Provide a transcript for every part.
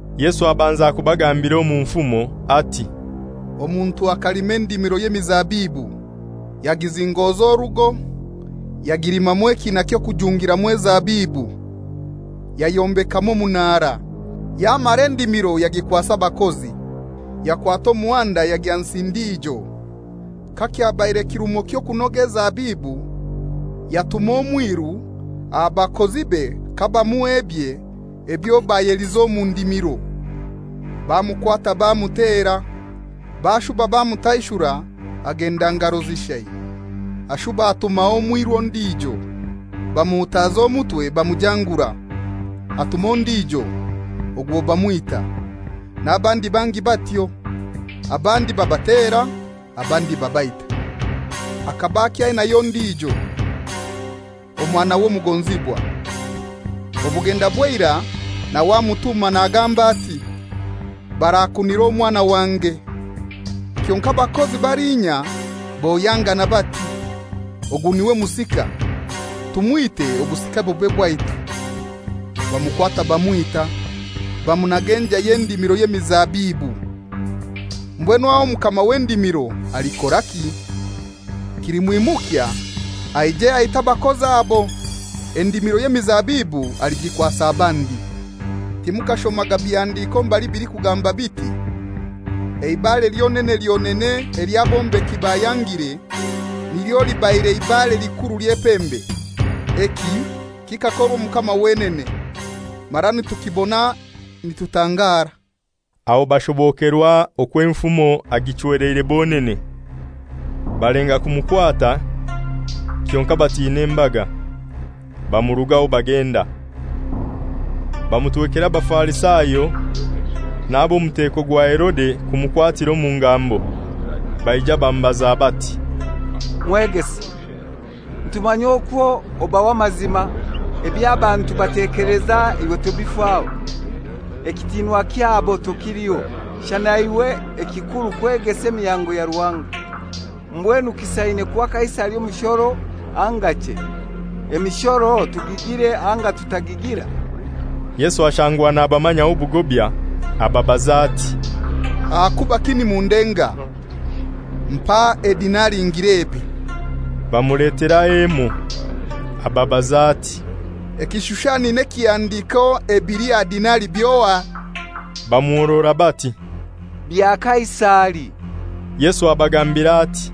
Yesu abanza kubagambira omu nfumo, ati, «Omuntu akalima endimiro y'emizabibu, yagizingoza orugo, yagilimamu ekiina ky'okujungiramu ezabibu, yayombekamu omunara, yamara endimiro yagikwasa abakozi, yakwata omuhanda yagya nsi ndijo. Kakyabaire kirumo ky'okunoga ezabibu, yatuma omwiru aha bakozibe kabamuha ebye ebyo bayelize omu ndimiro. Bamukwata bamutera, bashuba bamutaishura agenda ngaro zishai. Ashuba abatumaho omwiru ondijo, bamuhutaza omutwe bamujangura. Atuma ondijo, ogwo bamwita, n'abandi bangi batyo, abandi babatera, abandi babaita. Akaba akyainayo ondijo, omwanawe omugonzibwa; obugenda bw'eirai nawe amutuma nagamba ati, ‹Barakunira omwana wange.› Kyonkai abakozi balinya bohyangana bati, ‹Ogu n'iwe musika; tumwite obusika bube bwaitu.› Bamukwata bamwita, bamunaga enjai y'endimiro y'emizabibu. Mbwenu aho mukama w'endimiro alikoraki? Kilimwimukya aije aite abakozi abo. Endimiro y'emizabibu aligikwasa abandi. Timukashomaga bihandiko mbali bilikugamba biti, ‹Eibare lyonene lyonene ely'abombeki bayangire,nilyo libaire ibare likuru ly'epembe; eki kikakorwa Omukama wenene, mara nitukibona nitutangara?›» Aho bashobokerwa okwo enfumo agichweleire bonene; balenga kumukwata, kyonkai batina embaga. Bamurugaho bagenda. Bamutwekera Abafarisayo n'ab'omuteko gwa Herode kumukwatira omu ngambo. Baija bamubaza bati, «Mwegesa, nitukumanya okwo oba w'amazima, eby'abantu batekeleza iwe tobifaho. Ekitiinwa kyabo tokiliho, shana iwe ekikuru kwegesa emihango ya Ruhanga. Mbwenu kisaine kuha Kaisari omushoro anga chei? Emishoro tugigire anga tutagigira?» Yesu ashangwa nabamanyaho obugobya, abagambira ati, «Ahakubaki nimundenga? Mpa edinari ngilebe.» Bamuleteraho emoi. Ababaza ati, «Ekishushani n'ekihandiiko ebili aha dinari by'ohai?» Bamuhorora bati, «Bya Kaisari.» Yesu abagambira ati,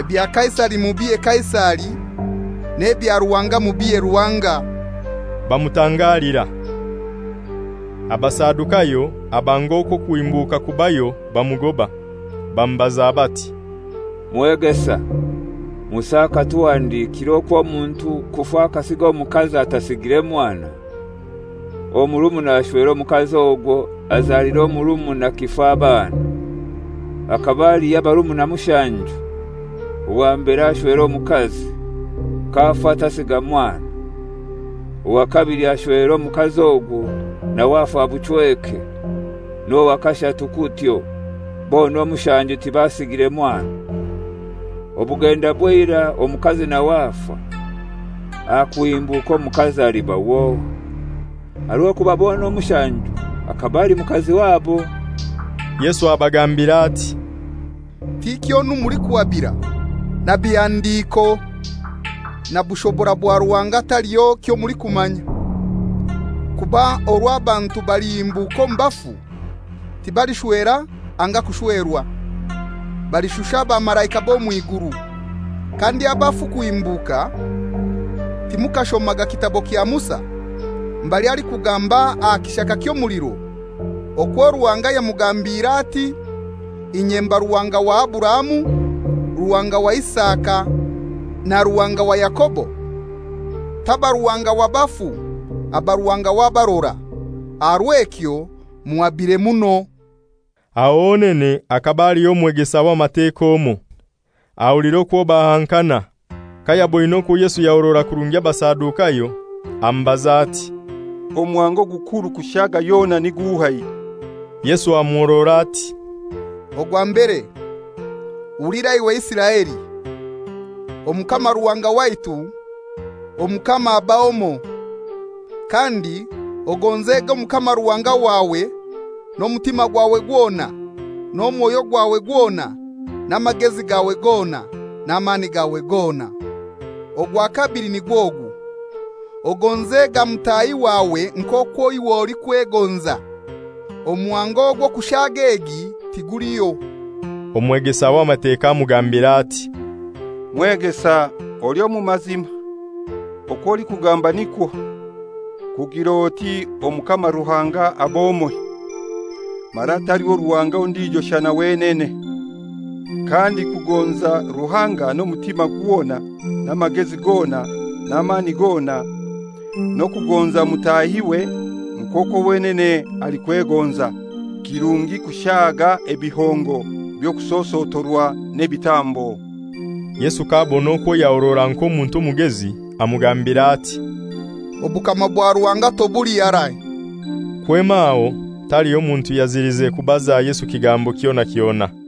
«Ebya Kaisari mubihe Kaisari, n'ebya Ruhanga mubihe Ruhanga.» Bamutangalira. Abasadukayo abanga okwo okuhimbuka kubayo bamugoba; bamubaza bati, «Mwegesa, Musa akatuhandikira okwo omuntu kufa akasiga omukazi atasigire mwana, omurumuna ashwere omukazi ogwo, azalire omurumuna kifa abaana. Hakaba aliho abarumuna mushanju. Owa mbere ashwera omukazi, k'afa tasiga mwana. Owa kabili ashwera omukazi ogwo, nawe afa buchweke; n'owa kashatu kutyo; bona omushanju tibasigire mwana. Obugenda bw'eirai omukazi nawe afa. Aha kuhimbuka omukazi aliba w'ohai? Aha rw'okuba bona omushanju akaba ali mukazi wabo.» Yesu abagambira ati, «Tikyonu mulikuhabira! Na bihandiko, na bushobora bwa Ruhanga taliho kyomulikumanya. Kuba orwo abantu balihimbuka omu bafu, tibalishwera anga kushwerwa. Balishusha abamalaika b'omw'iguru. Kandi abafu kuhimbuka, timukashomaga kitabo kya Musa, mbali alikugamba aha kishaka ky'omuliro, okwo Ruhanga yamugambiire ati, ‹Inye mba Ruhanga wa Aburahamu, Ruhanga wa Isaka na Ruhanga wa Yakobo?› Taba Ruhanga wa bafu, aba Ruhanga w'abarora; aha rw'ekyo muhabire muno.» Aho honene hakaba haliho omwegesa w'Amateka omoi, ahulira okwo bahankana. Kayaboine okwo Yesu yahorora kurungi Abasadukayo, amubaza ati, «Omuhango ogukuru kushaaga yona ni guhai?» Yesu amuhorora ati, «Ogwa mbere, ‹Hulira iwe Isiraeli: Omukama Ruhanga waitu, Omukama aba omoi. Kandi ogonzega Omukama Ruhanga wawe n'omutima gwawe gwona, n'omwoyo gwawe gwona, n'amagezi gawe gona, n'amani gawe gona.› Ogwa kabili nigw'ogu, ‹Ogonzega mutahi wawe nk'okwo iwe olikwegonza.› Omuhango ogw'okushaaga egi tiguliho.» Omwegesa w'Amateka amugambira ati, «Mwegesa oli omu mazima; okw'olikugamba nikwo, kugir'oti Omukama Ruhanga ab'omoi, mara taliho Ruhanga ondijo shana wenene. Kandi kugonza Ruhanga n'omutima gwona, n'amagezi gona, n'amani gona, n'okugonza mutahiwe nk'okwo wenene alikwegonza, kirungi kushaaga ebihongo by'okusosotorwa n'ebitambo.» Yesu k'abona okwo yahorora nk'omuntu omugezi, amugambira ati, «Obukama bwa Ruhanga tobuli harai.» Kwema aho taliho muntu yazilize kubaza Yesu kigambo kyona kyona.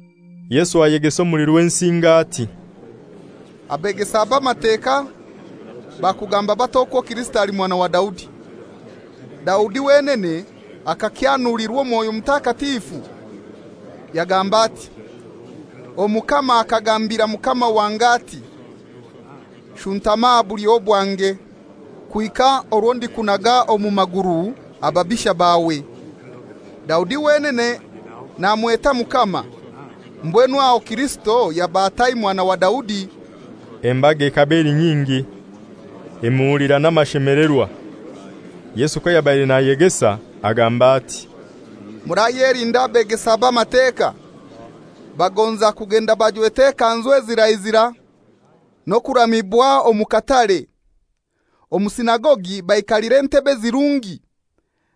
Yesu ayegesa omuli Rwensinga ati, «Abegesa b'Amateka bakugamba batai okwo Kirisito ali mwana wa Daudi? Daudi wenene akakyanulirwa Mwoyo Mutakatifu, yagamba ati,‹Omukama akagambira Mukama wange ati: Shuntama aha bulyo bwange, kuhika orwo ndikunaga omu maguru ababisha bawe.› Daudi wenene namweta ‹Mukama;› mbwenu aho Kirisito yaba atai mwana wa Daudi?» Embaga ekaba eli nyingi, emuhulira n'amashemelerwa. Yesu kayabaire nayegesa, agamba ati, «Murayelinda abegesa b'Amateka. Bagonza kugenda bajwete ekanzu ezira zira, n'okuramibwa omu katare, omu sinagogi baikalira entebe ezirungi,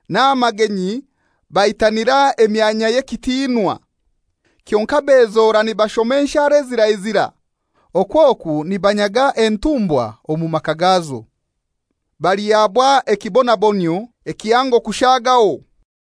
n'aha magenyi baitanira emyanya y'ekitinwa. Kyonkai bezora nibashoma enshara ezira zira, okwo oku nibanyaga entumbwa omu maka gazo. Balihabwa ekibonabonyio ekihango kushagaho.»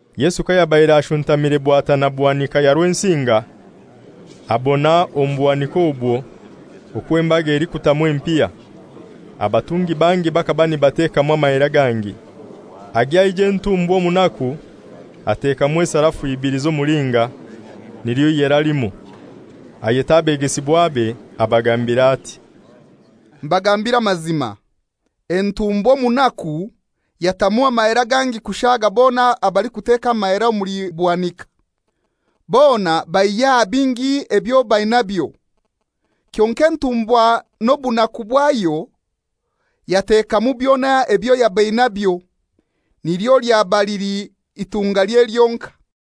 Yesu kayabaire ashuntamire bwatana buhanika ya Rwensinga, abona omu buhanika obwo okwo embaga elikutamu empiha. Abatungi bangi bakaba nibatekamu amahera gangi. Agya aija entumbwa omunaku, atekamu esarafu ibili z'omulinga, nilyo ihera limoi. Ayeta abegesibwabe abagambira ati, «Mbagambiire amazima, entumbwa omunaku yatamu amahera gangi kushaaga bona abalikuteeka amahera omuli buhanika. Bona baihya aha bingi byabo ebyo bainabyo; kyonkai entumbwa n'obunaku bwayo yatekamu byona ebyo yaba enabyo, nilyo lyaba lili itungalye lyonkai.»